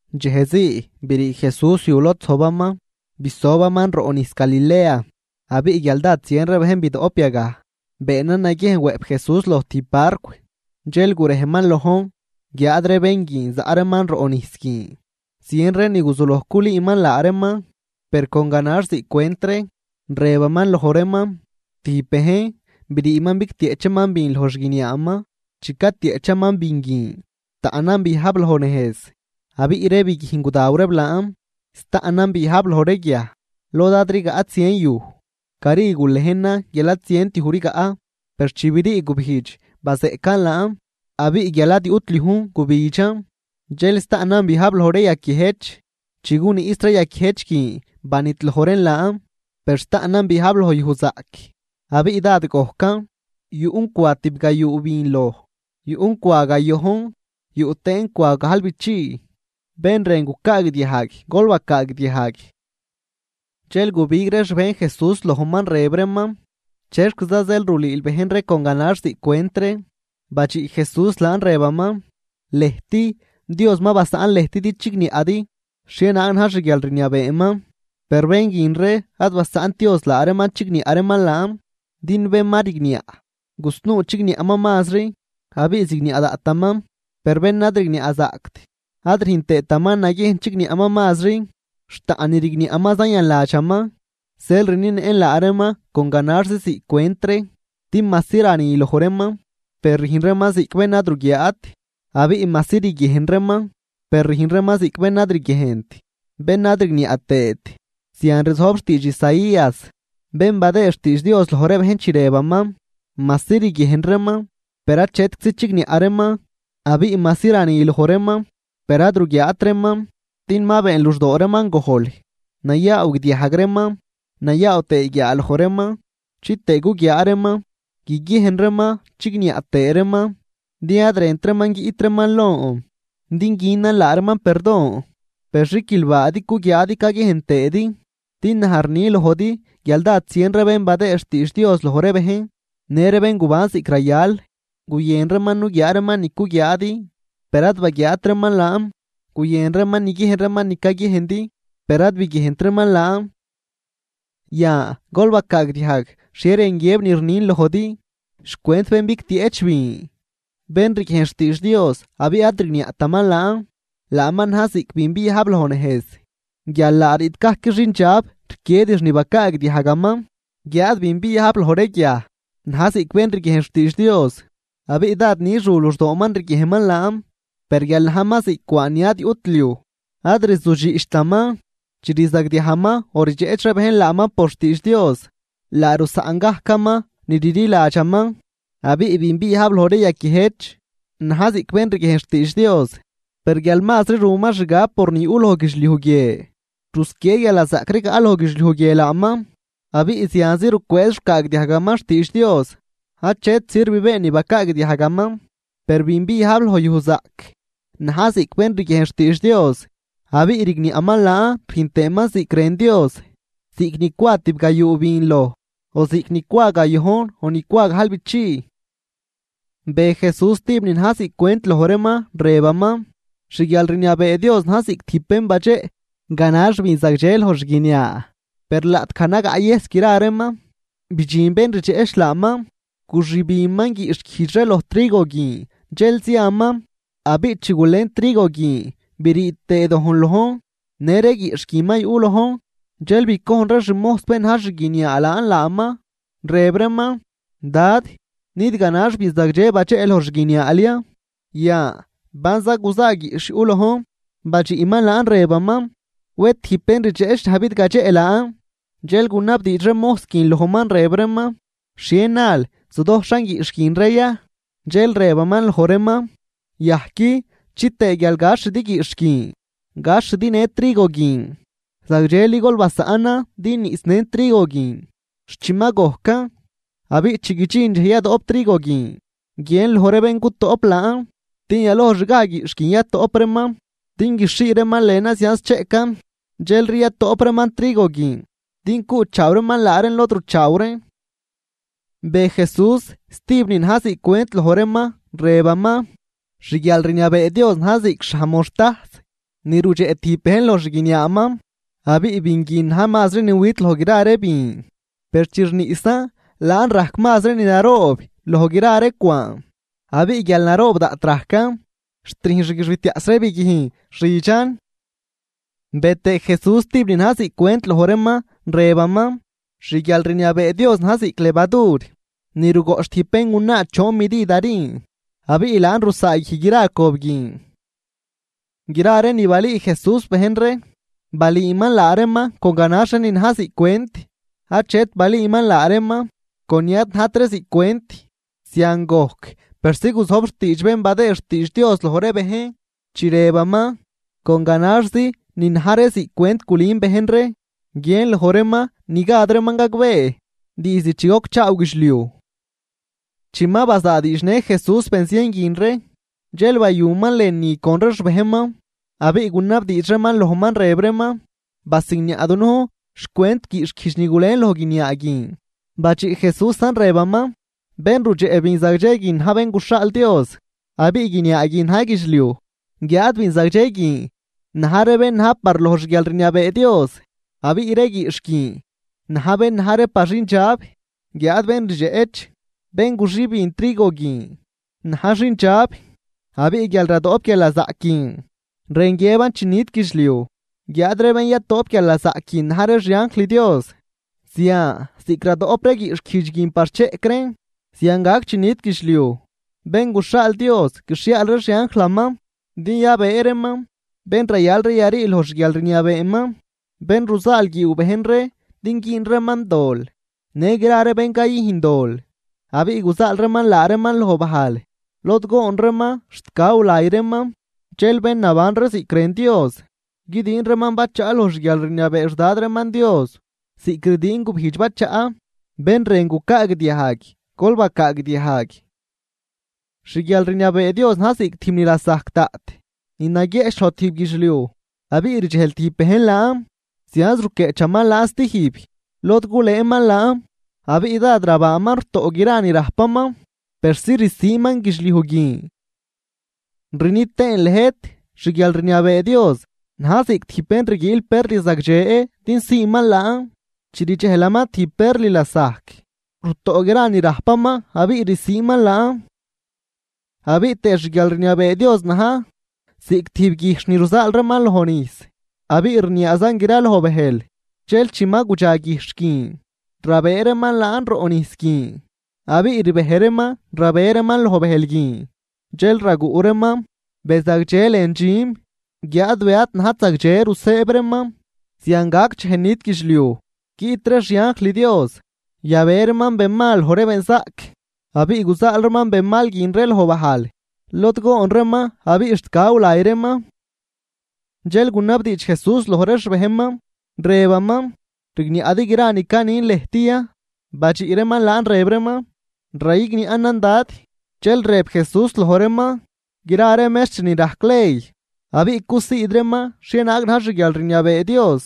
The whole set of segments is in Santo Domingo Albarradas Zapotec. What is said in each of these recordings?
Dxejzii brii Jesús yu lod zojbaman, bisobaman roꞌ nijs Galilea. Abiꞌ guial dád zien ree bejn bidoꞌp yagaj, beenan naguiejn wëꞌp Jesús loj tijb barcw dxel gurejman lojn, guiáad ree bén guin zaꞌ reeman roꞌ nijs guin. Zien ree ni guzuloj culüüman laa reeman, per con ganax ziꞌc cwent ree, rëbaman loj reeman: ―Tijb bejn, briiman bigtieꞌchaman bin loj xguiniaaman. Chi catieꞌchaman bin guin, taꞌnan biajb loj nejz, abiꞌ biꞌt ree biguijn gudaw reeb laan. Staꞌnan biajb loj ree guiaj lod ad rigaꞌt zien yuj, cari gulejnan guial ad zient yuj rigaꞌ. Per chi brii gubijdx, bazeꞌcan laan, abiꞌ guial ad yuꞌt liujn gubidxan. Dxel staꞌnan biajb loj ree yaquiëjch, chi guniꞌs ree yaquiëjch guin banidloj reen laan. Per staꞌnan biajb loj yuj zaꞌc, abiꞌ dád gojcan. Yuꞌn cwa tibgayuu bin loj, yuꞌn cwa gayojn yuꞌ tëën cwa gajlbichii. Bén rën gucaagdiajg, gol bacaagdiajg. Dxel gubig ree xbejn Jesús lojman rëb reeman: ―¿Chexquiza zeel rulüül bejn ree con ganax ziꞌc cwent ree? Badxiꞌ Jesús laan rëbaman: ―Lëjt, Dios ma basaꞌn lëjt din chigniaꞌdi xhienaag na̱j xguialrniabeeman, per bén guin ree ad basaꞌnt Dios laa reeman chigniaꞌ reeman laan. Din Bén ma rigniaꞌ, gusnuu chigniaꞌman mazri, abiꞌ zigniaꞌ daꞌtaman. Per bén ad rigniaꞌzaꞌct ad rüjn tëëtaman naguiejn chigniaꞌman mazri, xt taꞌn ni rigniaꞌman zayanladxaman. Zeel rnienëꞌn laa reeman con ganaxzi ziꞌc cwent ree. Din majsi rani loj reeman per rüjn reeman ziꞌc bén ad ruguiaat, abiꞌ majsi riguiejn reeman per rüjn reeman ziꞌc bén ad riguiejnt, bén ad rigniaꞌ tëët. Zian rzojb xtiidx Isaías, bén badëë xtiidx Dios loj ree bejn, chi rëbaman: Majsi riguiejn reeman, per achetczi chigniaꞌ reeman. Abiꞌ majsi rani loj reeman, per ad ruguiaat reeman. Din ma been luxdoo reeman gojl, nayaaw guidiajg reeman, nayaaw tëë guiaaloj reeman. Chitëë guguiaa reeman, guiguiejn reeman, chigniaꞌ tëë reeman. Din ad rënt reeman guiꞌt reeman lon din günan laa reeman perdon. ’Per xiquilbaadi cuguiaadi caguiejn tëëdi. Din naj rni lojdi guial dád zien ree bén badëë xtiidx Dios loj ree bejn, në ree bén guban ziꞌc rayal, guyën reeman nuguiaa reeman ni cuguiaadi per ad baguiaat reeman laan. Guyën reeman niguiejn reeman ni caguiejndi per ad biguiejnt reeman laan. ’Yan gol bacaagdiajg xhie rën guiëb ni rnin lojdi xcwent bén bigtieꞌch bin. Bén riguiejn xtiidx Dios abiꞌ ad rigniaꞌtaman laan, laaman na̱j ziꞌc bin biajb loj nejz, guial laa riꞌt gajc xindxab rquiedix ni bacaagdiajgaman. Guiáad bin biajb loj ree guiaj na̱j ziꞌc bén riguiejn xtiidx Dios, abiꞌ dád nix ru luxdooman riguiejnman laan, per guial najman ziꞌc cwaan ni ad yuꞌt xliuj, ad rzudxiꞌchtaman. Chi rzagdiajman o rdxeꞌch ree bejn laaman por xtiidx Dios, laa rusaꞌn gajcaman ni rliladxaman. Abiꞌ bin biajb loj ree yaquiëjch na̱j ziꞌc bén riguiejn xtiidx Dios, per guial mazri ruman xgab por ni yuꞌ loj guidxliuj guie, rusquiee guialnazaꞌc rigaꞌ loj guidxliuj guie laaman, abiꞌ zianzi rucwëëz rucaagdiajgaman xtiidx Dios achet sirv been ni bacaagdiajgaman. Per bin biajb loj yuj zaꞌc na̱j ziꞌc bén riguiejn xtiidx Dios abiꞌ rigniaꞌman laan rüjn tëëman ziꞌc rën Dios, ziꞌc ni cwa tibgayuu bin loj o ziꞌc ni cwa gayojn o ni cwa gajlbichii. Be Jesús stijb ni na̱j ziꞌc cwent loj reeman, rëbaman: ―Xguialrniabee Dios na̱j ziꞌc tijb bén badxeꞌ ganax bin zagdxe loj xguiniaa. Per laꞌtgaj nagaꞌyëjs gra reeman, bidxin bén rdxeꞌch laaman guxübinman guiꞌxhguijdx ree loj trigo guin dxel ziaman. Abiꞌ chi gulen trigo guin brii tëë dojn lojn në ree guiꞌxh guin ma yuꞌ lojn. Dxel bicojn ree xmojs bén naj xguiniaa laan laaman, rëb reeman: “Dad ¿nid ganax bin zagdxe badxeꞌ loj xguiniaal ya? yan, ¿banza guza guiꞌxh yuꞌ lojn?” Badxiꞌman laan rëbaman: “Wed tijb bén rdxeꞌch naj bidgadxeꞌ laan.” Dxel gunabdiix ree mojs guin lojman rëb reeman: “¿Xhie nal zudojxhan guiꞌxh guin ree ya?” Dxel rëbaman loj reeman: “Yajqui, chitëë guial gaxhidi guiꞌxh guin gaxhidi në trigo guin. Zagdxeli gol basaꞌnan din niꞌsnën trigo guin xt chi ma gojcan. Abiꞌ chi guidxin dxej yadoꞌp trigo guin guiën loj ree bén gutoꞌp laan din yalojxgaj guiꞌxh guin yatoꞌp reeman din guixhii reeman lënan zianz cheꞌcan. Dxelri yatoꞌp reeman trigo guin din cuꞌchaaw reeman laa reen lod ruchaaw reen.” Be Jesús stijb ni na̱j ziꞌc cwent loj reeman, rëbaman: ―Xguialrniabee Dios na̱j ziꞌc xhaj moxtajs, ni rudxeꞌ tijb bejn loj xguiniaaman. Abiꞌ bin guin na̱j mazri ni wit loj gra ree bin, per chi rniꞌsan laan rajc mazri ni naroob loj gra ree cwaan. Abiꞌ guial naroob daꞌt rajcan, xt rüjn xguixbitiaꞌs ree biguijn xidxan. Be tëë Jesús stijb ni na̱j ziꞌc cwent loj reeman, rëbaman: ―Xguialrniabee Dios na̱j ziꞌc levadur ni rugoꞌch tijb béngunaa choon midid harin, abiꞌ laan rusaaguij gra cob guin. Gra ree ni balüü Jesús bejn ree, balüüman laa reeman con ganax ree ni na̱j ziꞌc cwent, achet balüüman laa reeman con ni ad najt ree ziꞌc cwent. Zian gojc persi guzojb xtiidx bén badëë xtiidx Dios loj ree bejn, chi rëbaman: Con ganaxzi ni na̱j ree ziꞌc cwent gulün bejn ree, guiën loj reeman ni gad reeman gagbee diizd chi gocchaaw guidxliuj. Chi ma bazaadiidxnë Jesús benzien guin ree, dxel bayuman lënü con ree xbejnman, abiꞌ gunabdiidx reeman lojman, rëb reeman: ―Basigniaꞌ dunujn xcwent guiꞌxhguijdx ni gulen loj guiniaa guin. Badxiꞌ Jesúsan rëbaman: ―Bén rudxeꞌ bin zagdxe guin na̱j Bén guxhaal Dios, abiꞌ guiniaa guin na̱j guidxliuj. Guiáad bin zagdxe guin na̱j ree bén na̱j par loj xguialrniabee Dios. Abiꞌ ree guiꞌxh guin na̱j bén na̱j ree par xindxab. Guiáad bén rdxeꞌch, bén guxübin trigo guin na̱j xindxab. Abiꞌ guial radoꞌp guialnazaꞌc guin rën guiëb chi nit guidxliuj, guiáad ree bén yatoꞌp guialnazaꞌc guin na̱j ree xianjl Dios. Zian ziꞌc radoꞌp ree guiꞌxhguijdx guin par cheꞌc reen, zian gac chi nit guidxliuj. Bén guxhaal Dios guixhiaal ree xianjlaman din yabëë reeman bén rayal ree yarii loj xguialrniabeeman, bén ruzaalguiiw bejn ree din güün reeman dol në gra ree bén cayüjn dol. Abiꞌ guzaal reeman laa reeman loj bajl lod goon reeman xt gaw lay reeman. Dxel bén naban ree ziꞌc rën Dios, guidiin reeman bachaꞌ loj xguialrniabee xDad reeman Dios, ziꞌc rdiin gubijdx bachaꞌ. Bén rën gucaagdiajg, gol bacaagdiajg. ’Xguialrniabee Dios na̱j ziꞌc tijb ni lasajc daꞌt, ni naguieꞌch loj tijb guidxliuj. Abiꞌ rdxejl tijb bejn laan zianz ruquieꞌchaman laan stijb, lod gulëëman laan. Abiꞌ dád rabaaman rutoꞌ gra ni rajpaman persi rsiiman guidxliuj guin. ’Rni tëën lëjt: Xguialrniabee Dios na̱j ziꞌc tijb bén rguiil perl zagdxe din siiman laan. Chi rdxejlaman tijb perl lasajc, rutoꞌ gra ni rajpaman abiꞌ rsiiman laan. ’Abiꞌ tëë xguialrniabee Dios na̱j ziꞌc tijb guijxh ni ruzaal reeman loj nijs abiꞌ rniaazan graloj bëjl. Dxel chi ma gudxa guijxh guin rabëë reeman laan roꞌ nijs guin, abiꞌ rbej reeman rabe reeman loj bëjl guin, dxel raguꞌ reeman be zagdxe lën dxüm guiáad be ad najt zagdxe rusëëb reeman. Zian gac dxej nit guidxliuj, guiꞌt ree xianjl Dios yabe reeman benmal loj ree benzaꞌc. Abiꞌ guzaal reeman benmal guin ree loj bajl lod goon reeman abiꞌ xt gaw lay reeman. Dxel gunabdiidx Jesús loj ree xbejnman, rëbaman: ―¿Rigniaꞌdi gra ni canin lëjt ya? Badxiꞌ reeman laan rëb reeman: ―Rayigniaꞌnan, Dad. Dxel rëb Jesús loj reeman: ―Gra ree mextr ni rajc ley, abiꞌ cusiid reeman xhienaag na̱j xguialrniabee Dios,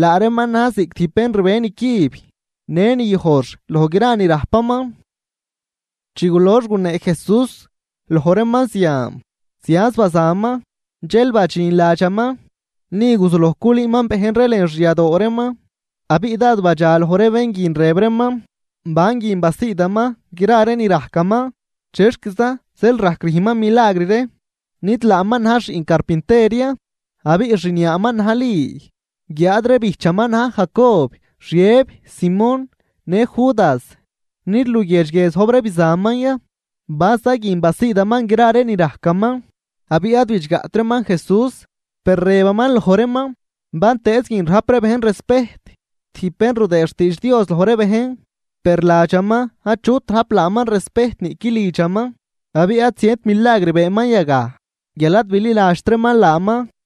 laa reeman na̱j ziꞌc tijb bén rbe nicüb në ni yojx loj gra ni rajpaman. Chi gulox gunee Jesús loj reeman zian, zianz bazaman. Dxel badxin ladxaman, ni guzuloj culüüman bejn ree lën xyadoo reeman. Abiꞌ dád badxaloj ree bén guin, rëb reeman: ―¿Ban guin basiidaman gra ree ni rajcaman? ¿Chexquiza zeel rajc rüjnman milagr ree? ¿Nid laaman na̱j xiꞌn carpinter ya, abiꞌ xniaaman na̱j Li, guiáad ree bijchaman na̱j Jacob, Xiëb, Simón, në Judas? ¿Nid luguiedx guie zojb ree bizanman ya? ¿Banza guin basiidaman gra ree ni rajcaman? Abiꞌ ad bidxgaꞌt reeman Jesús. Per rëbaman loj reeman: ―Bantëëz guin rajp ree bejn respejt tijb bén rudëë xtiidx Dios loj ree bejn, per ladxaman achut rajp laaman respejt niꞌqui lidxaman. Abiꞌ ad zient milagr beenman yagaj guial ad bililadxt reeman laaman.